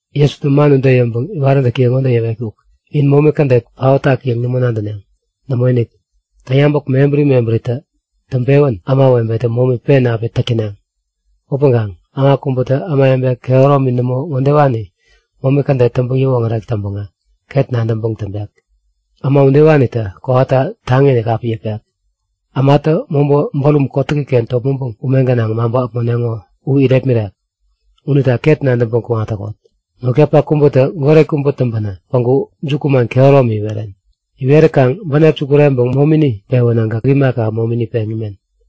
Jesutä man ude yäŋpäŋ iwaräntäkiye ŋode yäwetkuk; In momi kädet paotak yäŋ nämo nadäneŋ. Nämoinik! Täŋyabäk mebäri mebäritä täŋpewä ämawebetä momi pen api täk täneŋ. Upäŋkaŋ äma kubätä ämawebe kehäromini nämo ŋodewanita momi kädet täŋpäŋ yäwoŋärek täŋpäŋä ket nadäŋpäŋ kuŋarek. Äma udewanitä kowata taŋiinik api yäpek, ämatä mobä bärum kotäkiken topmäŋpäŋ ume gänaŋ maŋpä äpmoneŋo u irepmirek. Unita ket nadäŋpäŋ kuŋat täkot! Notkapak kubätä goret kubä täŋpänä päŋku jukuman kehäromi iweren. Iwerikaŋ bänep sukureŋpäŋ momini pewänä gäk imaka, momini peŋ imen.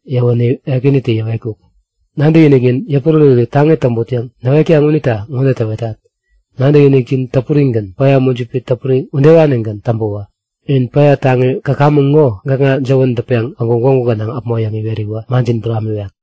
Yäwäwä Ekänitä yäwetkuk; Nadäkiniknin yäpuräräri taŋi täŋput yäŋ näwetkaŋ unita ŋode täwetat; Nadäkinikjin täpurigän, päya mujipi täpuri udewanigän täŋpäwä in päya taŋi käkamäŋ ŋo gäkŋa jäwän dätpeŋ päŋku gwägu gänaŋ äpmo yäŋ iweräwä manjin buramiwek.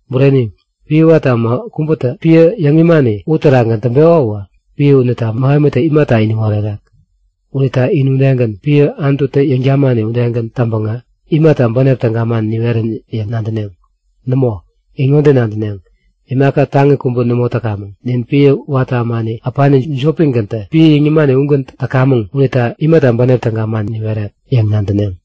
Bureni, piä watä äma kubätä piä yäŋ imani uterakgän täŋpeko uwä piä unita mähemitä imata iniŋ orerek? Unita in udegän, piä Anututä yäŋ-tamani udegän täŋpäŋä imata bänep täga man niwerän yäŋ nadäneŋ? Nämo, in ŋode nadäneŋ; Imaka taŋi kubä nämo täkamäŋ. Nin piä watä ämani äpani jopigäntä piä yäŋ nimani ugän täkamäŋ unita imata bänep täga man niwerek? yäŋ nadäneŋ.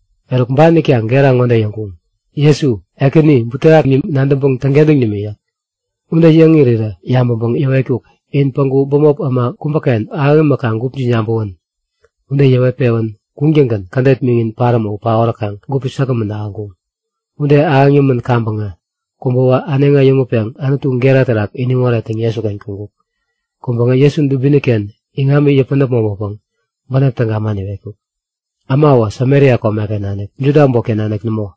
Eruk ban itkaŋ gera ŋode yäŋkuŋ; Jesu! Ekäni! Butewaki nadäŋpäŋ täŋkentäŋ nimi yäk. Ude yäŋ irirä yabäŋpäŋ yäwetkuk; In päŋku bämop äma kubäken ahäŋ imäkaŋ gupjin yabäwän. Ude yäwet-pewän kuŋtäŋgän kädet miŋin paräm u paoräkaŋ gupi säkgämän ahäŋkuŋ. Ude ahäŋ yämän kaŋpäŋä kubäwä äneŋi äyäŋutpeŋ Anutu gera terak iniŋ orettäŋ Jesuken kuŋkuk. Kuŋpäŋä Jesu dubini-ken iŋami yäpän äpmoŋpäpäŋ bänep täga man iwetkuk. Äma uwä Samaria komeken nanik, Juda äbotken nanik nämo.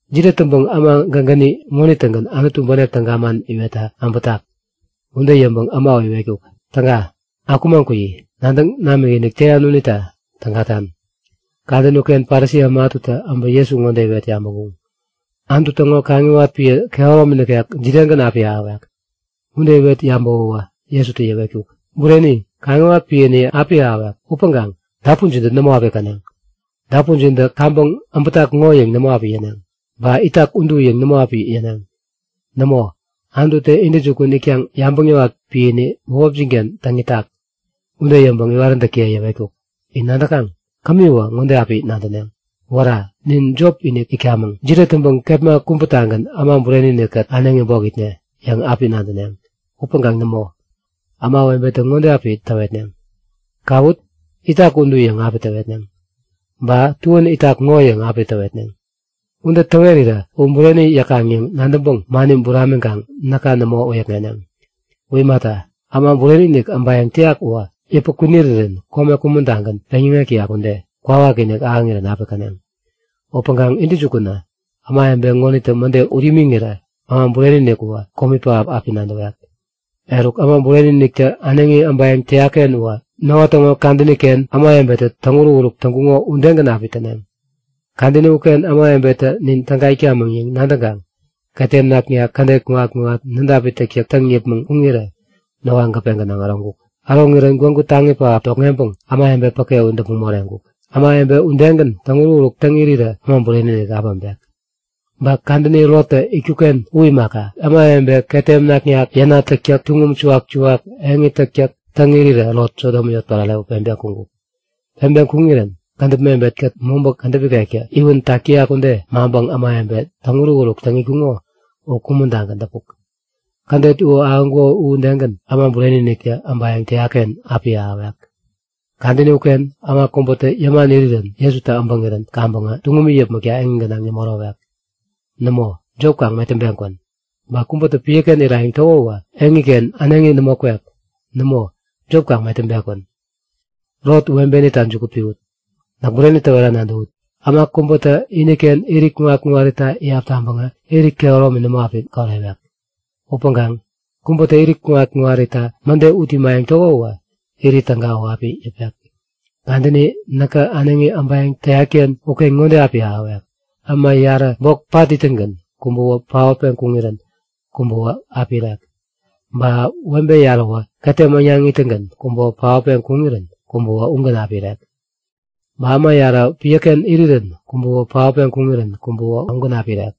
Jide täŋpäŋ äma gägäni ŋonitä-gän Anutu bänep täga man iwetta äbätak? Ude yäŋpäŋ äma u iwetkuk; Täga. Akumaŋ kuyi! Nadäŋ namikinik täyan unita tägatan. Kadäni uken Parisi äma ätutä äbä Jesu ŋode iwet yabäŋkuŋ; Anutu täŋo kaŋiwat piä kehäromi nikek jidegän api ahäwek? Ude iwet yabäwäwä Jesutä yäwetkuk; Bureni, kaŋiwat piäni api ahäwek upäŋkaŋ dapunjintä nämo api käneŋ. Dapunjintä kaŋpäŋ äbätak ŋo yäŋ nämo api yäneŋ, ba itak udu yäŋ nämo api yäneŋ. Nämo, Anututä intäjukun itkaŋ yabäŋ yäwat piäni bämopjin-ken täŋ itak. Ude yäŋpäŋ iwaräntäkiye yäwetkuk; In nadäkaŋ? Kämiwä ŋode api nadäneŋ; Wära! Nin jop-inik itkamäŋ. Jide täŋpäŋ kepma kubätagän Äma Bureni-inik-kät äneŋi bok itne? yäŋ api nadäneŋ. Upäŋkaŋ nämo. Ämawebetä ŋode api täwetneŋ; Kawut! Itak udu yäŋ api täwetneŋ. Ba, tuän itak ŋo yäŋ api täwetneŋ. Ude täwerirä u bureni yäkaŋ yäŋ nadäŋpäŋ mani buramiŋkaŋ näka nämo wäyäkŋeneŋ. U imata, Äma Bureni-inik äbayäŋ täyak uwä yäpä kwinirirän kome kumän-tagän peŋyäŋek täyak ude, kwawakinik ahäŋirän api käneŋ. Upäŋkaŋ intäjukunä, ämawebe ŋonitä mäde ut imiŋirä Äma Bureni-inik uwä komi pähap api nadäwek. Eruk, Äma Bureni-iniktä äneŋi äbayäŋ täyak-ken uwä Noa täŋo kadäni-ken ämawebetä täŋuruk-uruk täŋkuŋo udegän api täneŋ. Kadäni uken ämawebetä Nin täga itkamäŋ yäŋ nadäŋkaŋ ketem naknak, kädet kuŋat-kuŋat, nädapi täktäk täŋ yäpmäŋ kuŋirä Noa gäpe gänaŋ äroŋkuk. Äroŋirän gwägu taŋi pähap tokŋeŋpäŋ ämawebe päke u däpmäŋ moreŋkuk. Ämawebe udegän täŋuruk-uruk täŋ irirä Äma Bureni-inik api äpek. Ba kadäni Lottä itkuk-ken u imaka. Ämawebe ketem naknak, yänat täktäk, tuŋum suwak-suwak, eŋi täktäk täŋ irirä Lot Sodom yotpärare u peŋpeŋ kuŋkuk. Peŋpeŋ kuŋirän kädäp mebet-kät mobä kädäp ikektä iwän tak täyak ude maŋpäŋ ämawebe täŋuruk-uruk täŋ itkuŋo u kumän-tagän däpuk. Kädet u ahäŋkuko udegän Äma Bureni-iniktä äbayäŋ täyak-ken api ahäwek. Kadäni uken äma kubätä yäman irirän Jesutä äbäŋirän kaŋpäŋ tuŋumi yäpmäkta eŋi gänaŋ nämo ärowek. Nämo, jop kaŋ metäŋpeŋ kwän! Ba kubätä piäken irayäŋ täko uwä eŋiken äneŋi nämo kwek. Nämo, jop kaŋ metäŋpeŋ kwän. Lot webenita juku piwut! Näk bureni täwera nadäwut; Äma kubätä iniken irit kuŋat-kuŋarita iyap taŋpäŋä irit kehäromi nämo api korewek. Upäŋkaŋ kubätä irit kuŋat-kuŋarita mäde ut imayäŋ täko uwä irit täga u api yäpek. Kadäni näkä äneŋi äbayäŋ täyat-ken uken ŋode api ahäwek; Äma yarä, bok pat ittäŋgän kubäwä paotpeŋ kuŋirän kubäwä api irek. Ba webe yaräwä ketem äŋnaŋ ittäŋgän kubäwä paotpeŋ kuŋirän kubäwä ugän api irek. [ Ba äma yarä piäken irirän kubäwä paotpeŋ kuŋirän kubäwä ugän api irek.]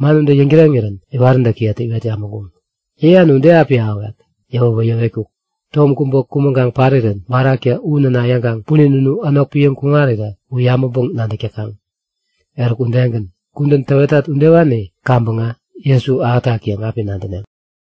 Man ude yäŋtäreŋirän iwaräntäkiyetä iwet yabäŋkuŋ; Yäyan u de api ahäwek? Yäwäwä yäwetkuk; Tom kubä kumäŋkaŋ parirän baraktä u näna yäŋkaŋ punin unu änok piäŋ kuŋarirä u yabäŋpäŋ-nadäk täkaŋ. Eruk udegän, kudän täwetat udewani kaŋpäŋä Jesu ahätak yäŋ api nadäneŋ.